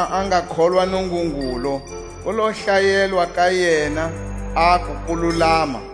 Kota lezi Abrahama a nga kholwa Nungungulu, ku lo hlayelwa ka yena aku kululama.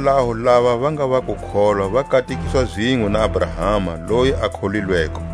Hikwalaho lava va nga va kukholwa va katekiswa zinwe na Abrahama loyi a kholilweko.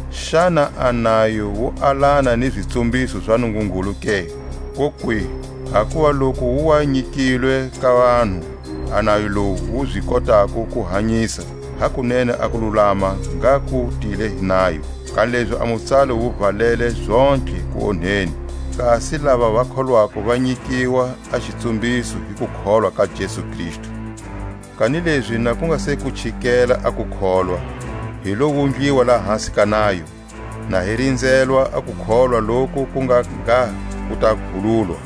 Xana a nayo wu alana ni zitsumhiso za Nungungulu ke? Kokwihi, hakuva loku wu wa nyikilwe ka vanhu a nayo lowu wu zi kotako ku hanyisa, hakunene a kululama ngha ku tile hi nayo. Kanilezi a mutsalo wu valele zontlhe kuonheni, kasi lava va kholwako va nyikiwa a xitsumbiso hi kukholwa ka Jesu Kristu. Kanilezi na ku nga se ku chikela a kukholwa, hi lo wundliwa lahasi ka nayo, na hi rinzelwa a kukholwa loku ku nga ngha ku ta vululwa.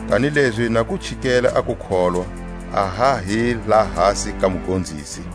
Kanilezi na ku chikele a kukholwa, a ha hi lahasi ka mugonzisi.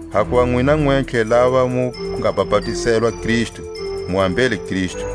Hakuva nwina nwentlhe lava mu nga bapatizelwa Kristu, mu ambele Kristu.